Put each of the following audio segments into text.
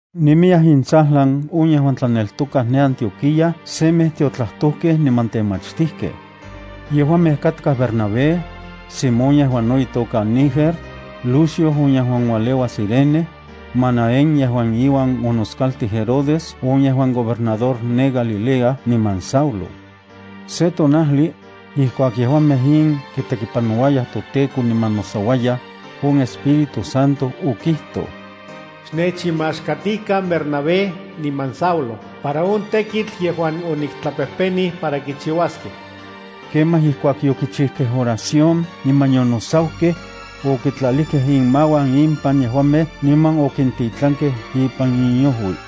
Nemiyaj intsajlan on yejuan tlaneltokaj ne Antioquía semej tiotlajtojkej niman temachtijkej. Yejuamej katkaj Bernabé, Simón yejuan no itoka Niger, Lucio on yejuan ualeua Cirene, Manaén yejuan iuan onoskaltij Herodes on yejuan gobernador ne Galilea niman Saulo. Se tonajli, ijkuak yejuamej in kitekipanouayaj toTEKO niman nosauayaj, on Espíritu Santo okijtoj: —Xnechinmaxkatikan Bernabé niman Saulo para on tekitl yejuan oniktlapejpenij para kichiuaskej. Kemaj ijkuak yokichijkej oración niman yonosaukej, okitlalijkej inmauan impan yejuamej niman okintitlankej ipan inojui.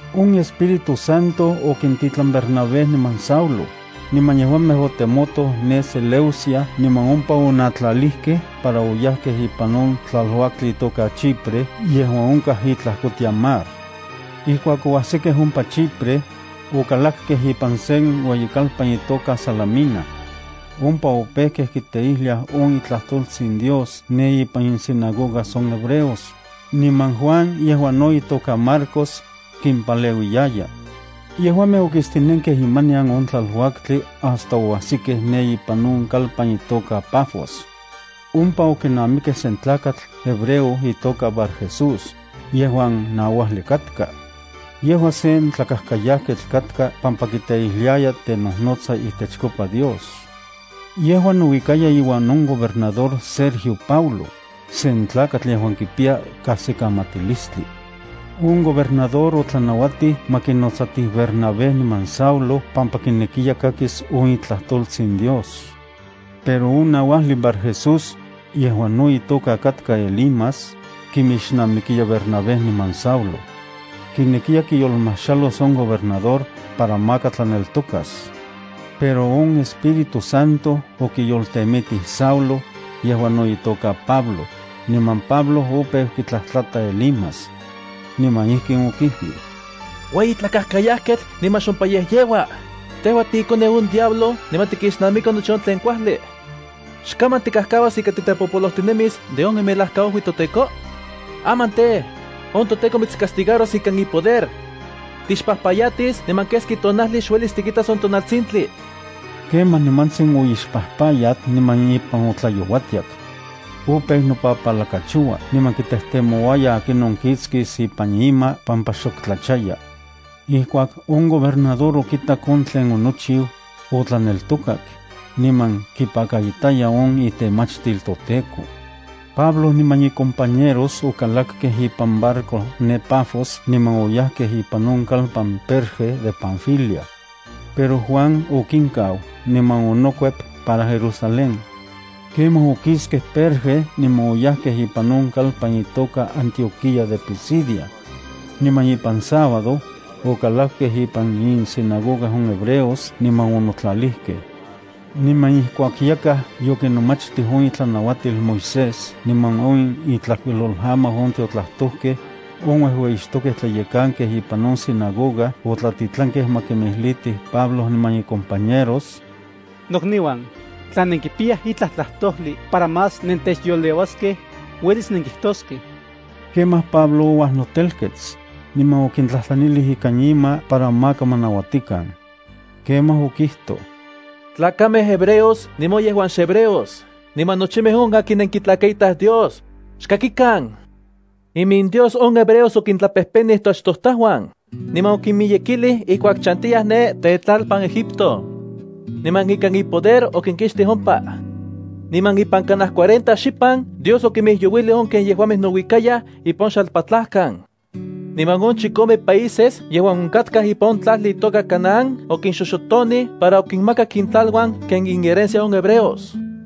On Espíritu Santo okintitlan Bernabé niman Saulo, niman yejuamej otemotoj ne Seleucia niman ompa onatlalijkej para oyajkej ipan on tlaluaktli itoka Chipre yejuan onkaj itlajkotian mar. Ijkuak oajsikej ompa Chipre, okalakkej ipan sen ueyikalpan itoka Salamina. Ompa opejkej kiteijliaj on itlajtoltsin Dios ne ipan insinagogas on hebreos, niman Juan, yejuan no itoka Marcos, kimpaleuiyaya. Yejuamej okistinenkej imanian on tlaluaktli hasta oajsikkej ne ipan on kalpan itoka Pafos. Ompa okinamikej sen tlakatl hebreo itoka Barjesús, yejuan nauajli katka. Yejua sen tlakajkayajketl katka pampa kiteijliaya tenojnotsa itechkopa Dios. Yejua nouikaya iuan on gobernador Sergio Paulo, sen tlakatl yejuan kipiya kajsikamatilistli. On gobernador otlanauatij ma kinotsatij Bernabé niman Saulo pampa kinekiya kakis on itlajtoltsin Dios. Pero on nauajli Barjesús, yejuan no itoka katka Elimas, kimixnamikiya Bernabé niman Saulo. Kinekiya kiyolmajxalos on gobernador para maka tlaneltokas. Pero on Espíritu Santo okiyoltemitij Saulo, yejuan no itoka Pablo, niman Pablo opeu kitlajtlata Elimas. Niman ijkin okijlij: —¡Ueyi tlakajkayajketl niman xompayejyeua! Tejua tiikoneu on diablo niman tikixnamiki nochi on tlen kuajli. ¿Xkaman tikajkauas ika titepopolojtinemis de on imelajkaojuitsin toTEKO? Aman tej, on toTEKO mitscastigaros ikan ipoder. Tixpajpayatis niman keski tonajli xuelis tikitas on tonaltsintli. Kemaj nimantsin oixpajpayat niman ipan otlayouatiak. Opeu nopapalakachoua niman kitejtemouaya akinon kiktsis ipan ima pampa xok tlachaya. Ijkuak on gobernador okitak on tlen onochiu, otlaneltokak, niman kipakaitaya on itemachtil toTEKO. Pablo niman icompañeros okalakkej ipan barco ne Pafos niman oyajkej ipan on kalpan Perge de Panfilia. Pero Juan okinkau niman onokuep para Jerusalén. Kemaj okiskej Perge niman oyajkej ipan on kalpan itoka Antioquía de Pisidia. Niman ipan sábado, okalakkej ipan insinagoga on hebreos niman onotlalijkej. Niman ijkuak yakaj yokinomachtij on itlanauatil Moisés niman on intlajkuilolamau on tiotlajtojkej, on uejueyixtokej tlayekankej ipan on sinagoga otlatitlankej ma kimijlitij Pablo niman icompañeros: —Nokniuan, tla nenkipiyaj itlaj tlajtojli para más nentechyoleuaskej, uelis nenkijtoskej. Kemaj Pablo ouajnotelkets, niman okintlajtlanilij ikan ima para maka ma nauatikan. Kemaj okijtoj: —Tlakamej hebreos niman on yejuan xehebreos niman nochimej on akin nenkitlakaitaj Dios, xkakikan. IminDios on hebreos okintlapejpenij toachtojtajuan, niman okinmiyekilij ijkuak chantiyaj ne tetlalpan Egipto. Niman ikan ipoder okinkixtij ompa. Niman ipan kanaj cuarenta xipan Dios okimijyouilij on ken yejuamej nouikayaj ipan on xalpatlajkan. Niman on chikome países yejuan onkatkaj ipan on tlajli itoka Canaán okinxoxotonij para okinmakak intlaluan ken inherencia on hebreos.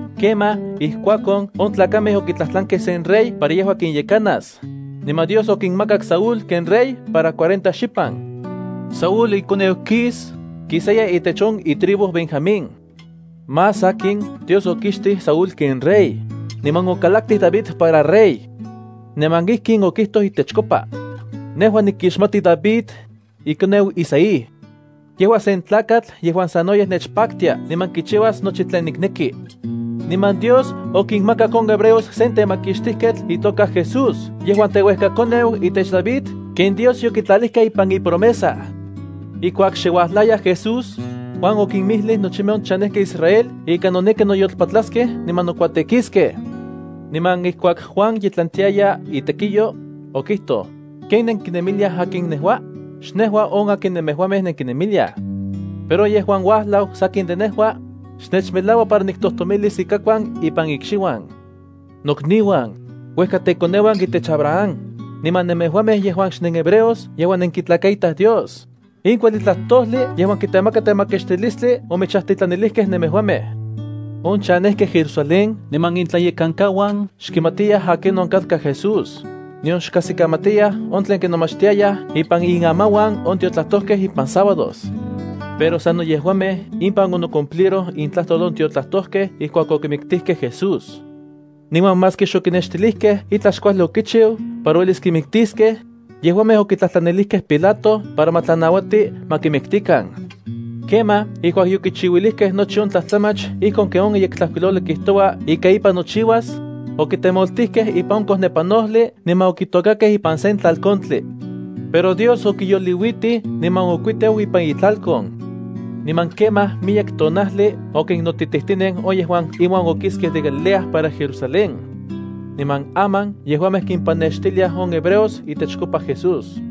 Kemaj ijkuakon on tlakamej okitlajtlankej sen rey para yejua kinyekanas, niman Dios okinmakak Saúl ken rey para cuarenta xipan. Saúl ikoneu Quis, kisaya itech on itribu Benjamín. Más sakin Dios okixtij Saúl ken rey, niman okalaktij David para rey. Niman ijkin okijtoj itechkopa: “Nejua nikixmati David, ikoneu Isaí. Yejua sen tlakatl yejuan sanoyej nechpaktia niman kichiuas nochi tlen nikneki.” Niman Dios okinmakak on hebreos sen temakixtijketl itoka Jesús yejuan teuejkakoneu itech David ken Dios yokitlalijka ipan ipromesa. Ijkuak xe uajlaya Jesús, Juan okinmijlij nochimej on chanejkej Israel ika noneki noyolpatlaskej niman nokuatekiskej. Niman ijkuak Juan ye tlantiaya itekiyo, okijtoj: “¿Ken nenkinemiliaj akin nejua? Xnejua on akin nemejuamej nenkinemiliaj. Pero on yejuan uajlau sakin de nejua, xnechmelaua para niktojtomilis ikakuan ipan ikxiuan.” ’Nokniuan, uejkatekoneuan itech Abraham, niman nemejuamej yejuan xnenhebreos yejuan nenkitlakaitaj Dios, in kuajli tlajtojli yejuan kitemaka temakixtilistli omechajtitlanilijkej nemejuamej. On chanejkej Jerusalén niman intlayekankauan xkimatiyaj akinon katka Jesús, nion xkajsikamatiyaj on tlen kinomachtiayaj ipan inamauan on tiotlajtojkej ipan sábados. Pero sano yejuamej inpan onocumpliroj intlajtol on tiotlajtojkej ijkuak okimiktijkej Jesús. Niman maski xokinextilijkej itlaj xkuajli okichiu para uelis kimiktiskej, yejuamej okitlajtlanilijkej Pilato para ma tlanauati ma kimiktikan. Kemaj ijkuak yokichiuilijkej nochi on tlajtlamach ijkon ken on Yektlajkuilojli kijtoua ika ipan nochiuas, okitemoltijkej ipan on kojnepanojli niman okitokakej ipan sen tlalkontli. Pero Dios okiyoliuitij niman okuiteu ipan itlalkon. Niman kemaj miyek tonajli okinnotitijtinen on yejuan iuan okiskej de Galilea para Jerusalén. Niman aman yejuamej kimpanextiliaj on hebreos itechkopa Jesús.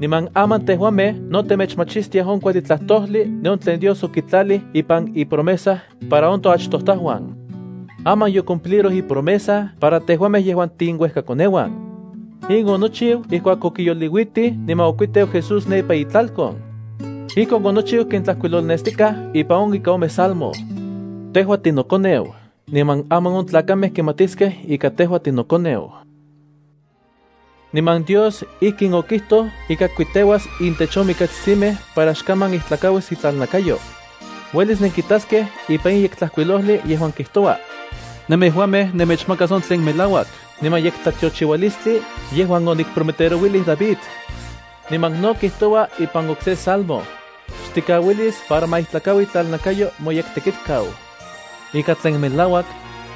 ’Niman aman tejuamej no temechmachistiaj on kuajli tlajtojli de on tlen Dios okitlalij ipan ipromesa para on toachtojtajuan. Aman yocumpliroj ipromesa para tejuamej yejuan tiinuejkakoneuan. In onochiu ijkuak okiyoliuitij niman okuiteu Jesús ne ipan itlalkon. Ijkon onochiu ken tlajkuilolnestikaj ipan on ika ome salmo: “Tejua tinoKoneu niman aman on tlakamej kimatiskej ika tejua tinoKoneu.” Niman Dios ijkin okijtoj ika kikuiteuas intech on mikatsitsimej para xok kaman ijtlakauis itlalnakayo. Uelis nenkitaskej ipan in Yektlajkuilojli yejuan kijtoua: “Nemejuamej nemechmakas on melauak niman yektlatiochiualistli yejuan onikprometerouilij David.” Niman no kijtoua ipan okse salmo: “Xtikauilis para ma ijtlakaui itlalnakayo moyekTekitkau.” Ika tlen melauak,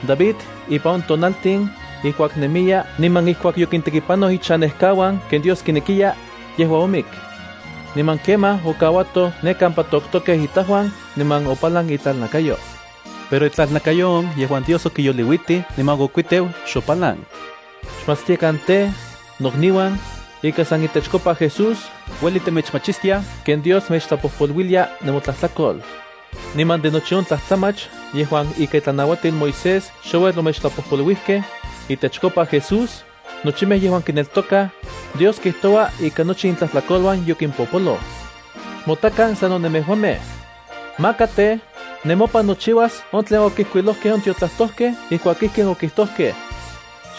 David ipan on tonaltin ijkuak nemiya niman ijkuak yokintekipanoj ichanejkauan ken Dios kinekiya, yejua omik. Niman kemaj okauatoj ne kampa toktokej itajuan niman opalan itlalnakayo. Pero itlalnakayo on yejuan Dios okiyoliuitij niman okuiteu xopalan. Xmatstiakan tej, nokniuan, ika san itechkopa Jesús ueli temechmachistiaj ken Dios mechtlapojpoluilia nemotlajtlakol. Niman de nochi on tlajtlamach yejuan ika itlanauatil Moisés xouel omechtlapojpoluijkej, itechkopa Jesús, nochimej yejuan kineltokaj, Dios kijtoua ika nochi intlajtlakoluan yokimpopoloj. Xmotakan sano nemejuamej. Maka tej, nemopan nochiuas on tlen okijkuilojkej on tiotlajtojkej ijkuak ijkin okijtojkej: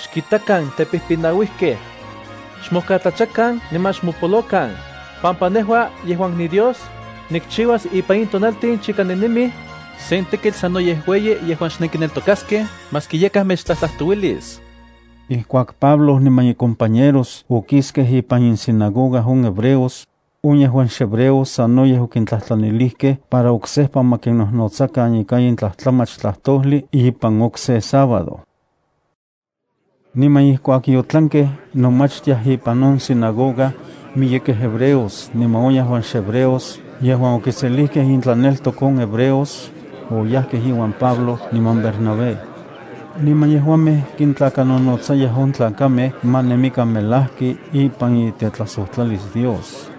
Xkitakan tepijpinauijkej. Xmojkatlachakan niman xmopolokan, pampa nejua yejuan niDios, nikchiuas ipan in tonaltin chika nennemij sen tekitl sanoyej ueyi yejuan xnenkineltokaskej maski yakaj mechtlajtlajtouilis. Ijkuak Pablo niman icompañeros okiskej ipan insinagoga on hebreos, on yejuan xhebreos sanoyej okintlajtlanilijkej para oksejpa ma kinnojnotsakan ika in tlajtlamach tlajtojli ipan okse sábado. Niman ijkuak yotlankej nomachtiaj ipan on sinagoga, miyekej hebreos niman on yejuan xhebreos yejuan okiselijkej intlaneltok on hebreos, oyajkej iuan Pablo niman Bernabé. Niman yejuamej kintlakanonotsayaj on tlakamej ma nemikan melajki ipan itetlajsojtlalis Dios.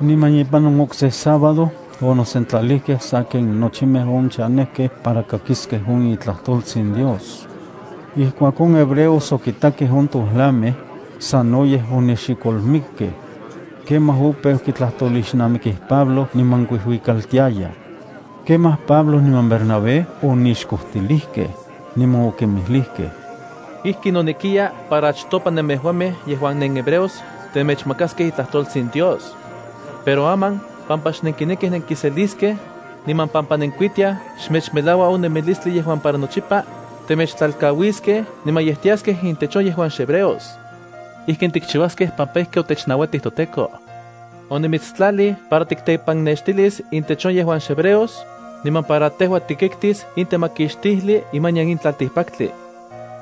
Niman ipan on okse sábado onosentlalijkej sa ken nochimej on chanejkej para kakiskej on itlajtoltsin Dios. Ijkuak on hebreos okitakej on tojlamej, sanoyej onexikolmikkej. Kemaj opeu kitlajtolixnamikij Pablo niman kuijuikaltiayaj. Kemaj Pablo niman Bernabé onixkojtilijkej, niman okinmijlijkej: —Ijki nonekiya para achtopa nemejuamej yejuan nenhebreos temechmakaskej itlajtoltsin Dios. Pero aman pampa xnenkinekij nenkiseliskej, niman pampa nenkuitiaj xmechmelaua on nemilistli yejuan para nochipa, temechtlalkauiskej niman yej tiaskej intech on yejuan xhebreos. Ijkin tikchiuaskej pampa ijki otechnauatij toTEKO: Onimitstlalij para tiktepannextilis intech on yejuan xhebreos, niman para tejua tikiktis in temakixtijli imanian in tlaltikpaktli.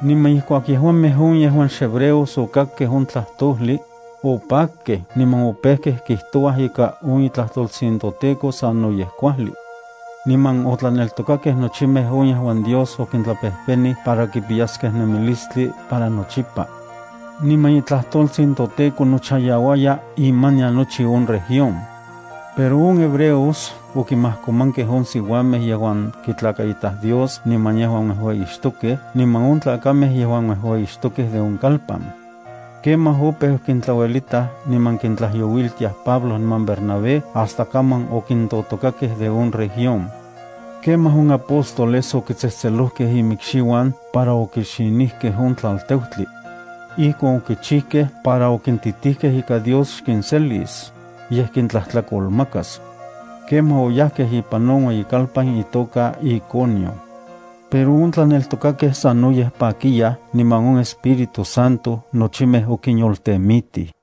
Niman ijkuak yejuamej on yejuan xhebreos okakkej on tlajtojli, opakkej niman opejkej kijtouaj ika on itlajtoltsin toTEKO sanoyej kuajli. Niman otlaneltokakej nochimej on yejuan Dios okintlapejpenij para kipiyaskej nemilistli para nochipa. Niman itlajtoltsin toTEKO nochayauaya imanian nochi on región. Pero on hebreos okimajkomankej on siuamej yejuan kitlakaitaj Dios niman yejuan uejueyixtokej niman on tlakamej yejuan uejueyixtokej de on ueyikalpan. Kemaj opeu kintlauelitaj niman kintlayouiltiaj Pablo niman Bernabé hasta kaman okintotokakej de on región. Kemaj on apóstoles okitsejtselojkej imikxiuan para okixinijkej on tlalteutli. Ijkon okichijkej para okintitijkej ika Dios xkinselis, yej kintlajtlakolmakas. Kemaj oyajkej ipan on ueyikalpan itoka Iconio. Pero on tlaneltokakej sanoyej pakiyaj niman on Espíritu Santo nochimej okinyoltemitij.